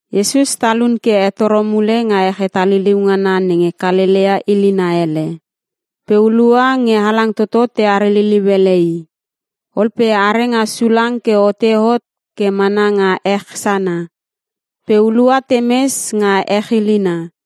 Iesus talun ke hetoro mule nga ech hetaliliu ngana nenge Kalelea ilina hele. Pe hulua nge halang toto teare liliu ele i. Ol pe are nga sulang ke ote hot ke mana nga ech sana. Pe hulua temes nga ech ilina.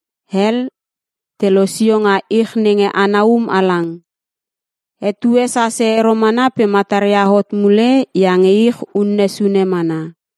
Hel te losio nga ich nenge ana um halang. Etue sase ero mana pe mataria hot mule iange ich une sune mana.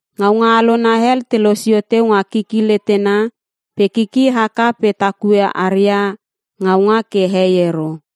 Ngaunga alona hel te losio teu nga kiki letena pe kiki haka pe takue aria ngaunga ke hei ero.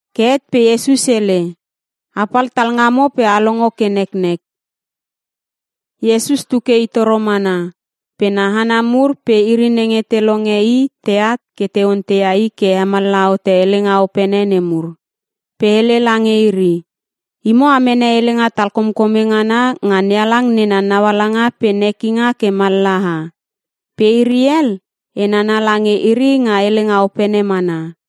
Ke het pe Iesus hele, “A pal talngamo pe a longo ke neknek!” Iesus tu ke i toro mana pe na hana mur pe iri nenge te longe i teat ke te onteia i ke hemallaha hote helenga opene nemur. Pe hele lange iri, “Imo a mene helenga talkomkome ngana nga NeHalang nena naualanga pe nekinga ke mallaha. Pe iri hel, e nana lange iri nga helenga opene mana.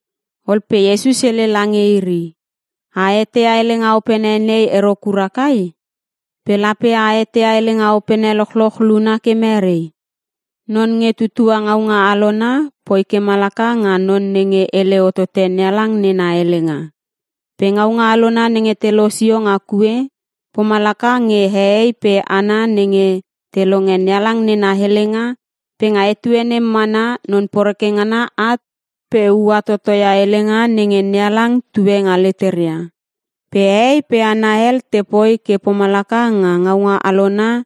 Ol pe Iesus hele lange iri, “A eteia helenga opene nei ero kura kai? Pe lape a eteia helenga opene lochloch luna ke mere? Non nge tutua ngaunga alona poi ke malaka nge non nenge hele hotote NeHalang nena helenga. Pe ngaunga alona nenge te losio nga kue, pomalaka nge hehei pe hana nenge te longe NeHalang nena helenga pe nga etue nem mana non poreke ngana at pe uaia totoia helenga nenge NeHalang tue nga leteria. Pe hehei pe hana hel te poi ke pomalaka nga ngaunga alona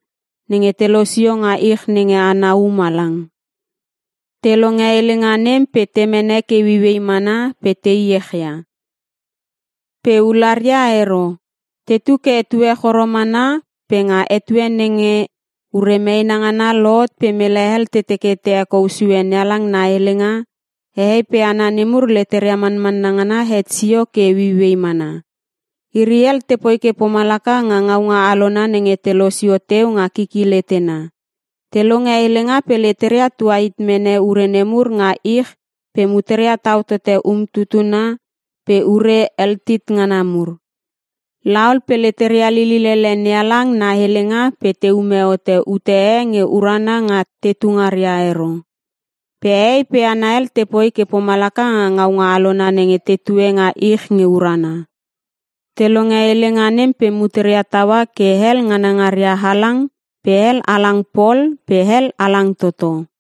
nenge te losio nga ich nenge ana um halang. Te longe helenga nem pe te mene ke ueiuei mana pe te iech ia. Pe ularia ero. Tetu ke etue choro mana pe nga etue nenge ure meena ngana lohot pe mele hel te teke te hekou sue NeHalang na helenga, hehei pe hana nemur leteria manmanna ngana het sio ke ueiuei mana. Iri hel te poi ke pomalaka nga ngaunga alona nenge te losio teu nga kiki letena. Te longe helenga pe leteria tuhit mene ure nemur nga ich pe muteria tau tote umtutuna pe ure eltit ngana mur. La ol pe leteria lilil ele NeHalang na helenga pe te ume hote ute e nge urana nga tetu ngaria ero. Pe hehei pe hana hel te poi ke pomalaka nga ngaunga alona nenge tetue nga ich nge urana. Te longe helenga nem pe muteria taua ke hel ngana ngaria halang pe hel halang pol pe hel halang toto.”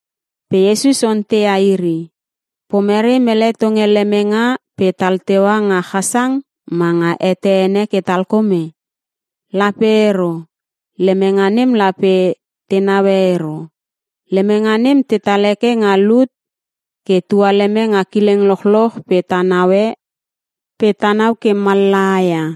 Pe Iesus onteia iri, “Pomere, mele tonge lemenga pe tal teua nga chasang ma nga hete ene ke talkome? Lape ero! Lemenga nem lape te neue ero. Lemenga nem tetal heke nga lut ke tualeme nga kileng lochloch pe tenau ke mallaha ia.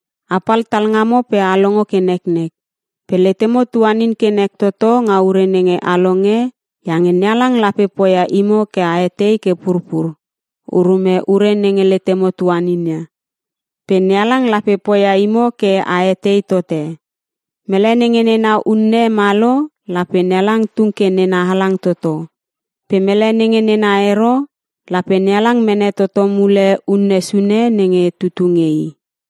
Apal talngamo pe a longo ke neknek! “Pe letemo tuanin ke nek toto nga ure nenge a longe iange NeHalang lape poia imo ke a etei ke purpur, urume ure nenge letemo tuanin ia. Pe NeHalang lape poia imo ke a etei tote. Mele nenge nena unne ma lo, lape NeHalang tung ke nena halang toto. Pe mele nenge nena ero, lape NeHalang mene toto mule unne sune nenge tutu nge i.”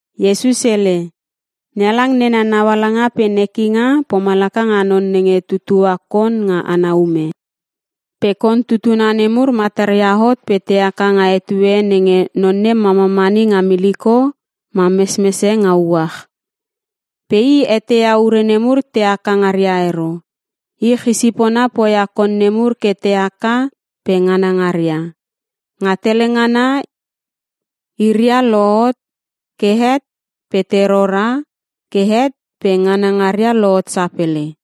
Iesus hele, “NeHalang nena naualanga pe nekinga pomalaka nga non nenge tutua kon nga ana ume. Pe kon tutuna nemur mataria hot pe te haka nga etue nenge non nem mamamani nga miliko ma mesmese nga uach. Pe i eteia ure nemur te haka ngaria ero. Ich isipona poia kon nemur ke te haka pe nganangaria. Nga tele ngana iria lohot, ke het pe te rora ke het pe nganangaria lohot sapele.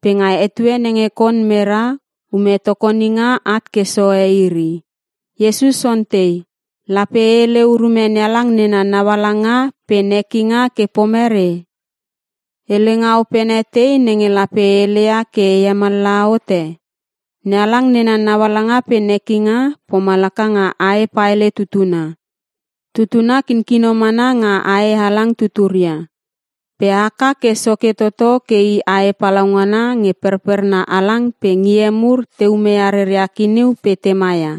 Pe nga etue nenge kon mera, ume tokoninga at ke sohe iri.” Iesus ontei, “Lape e hele urume NeHalang nena naualanga pe nekinga ke pomere? Helenga opene tei nenge lape e heleia ke e hemallaha hote? NeHalang nena naualanga pe nekinga, pomalaka nga ae paele tutuna. Tutuna kinkino mana nga ae halang tuturia pe haka ke soke toto ke i ae palaungana nge perperna halang pe ngie mur te umeia reria kiniu pe tema ia.”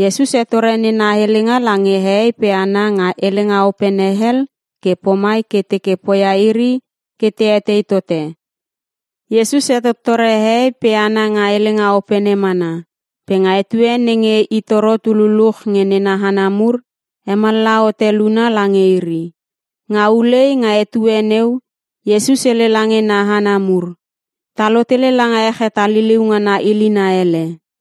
Iesus hetore nena helenga lange hehei pe hana nga helenga opene hel ke pomai ke teke poia iri ke te etei tote. Iesus hetottore hehei pe hana nga helenga opene mana, pe nga etue nenge i toro tu luluch nge nena hana mur, hemallaha hote luna lange iri. Nga ulei nga etue neu, Iesus hele lange na hana mur, “Ta lotele langa ech hetaliliu ngana ilina hele.”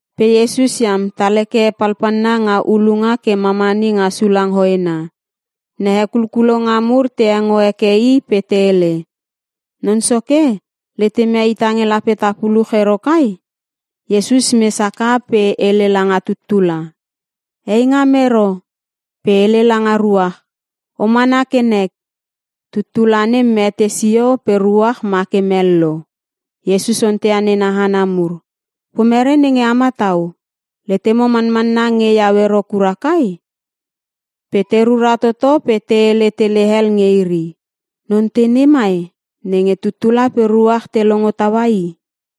Pe Iesus iam tal heke palpalna nga ulunga ke mamani nga sulang hoena. Na hekulkulonga mur te hengo heke i pe te hele, “Non soke, letemia ita nge lape ta puluch ero kai?” Iesus mes haka pe hele langa tuttula, “Heingam ero!” Pe hele langa ruach, “O mana ke nek!” Tuttula nem mete sio pe ruach ma ke mello. Iesus onteia nena hana mur, “Pomere nenge a matau? Letemo manmanna nge iau ero kura kai?” Pe te rura toto pe te hele tele hel nge iri, “Non tei nei mai, nenge tuttula pe ruach te longo taua i?”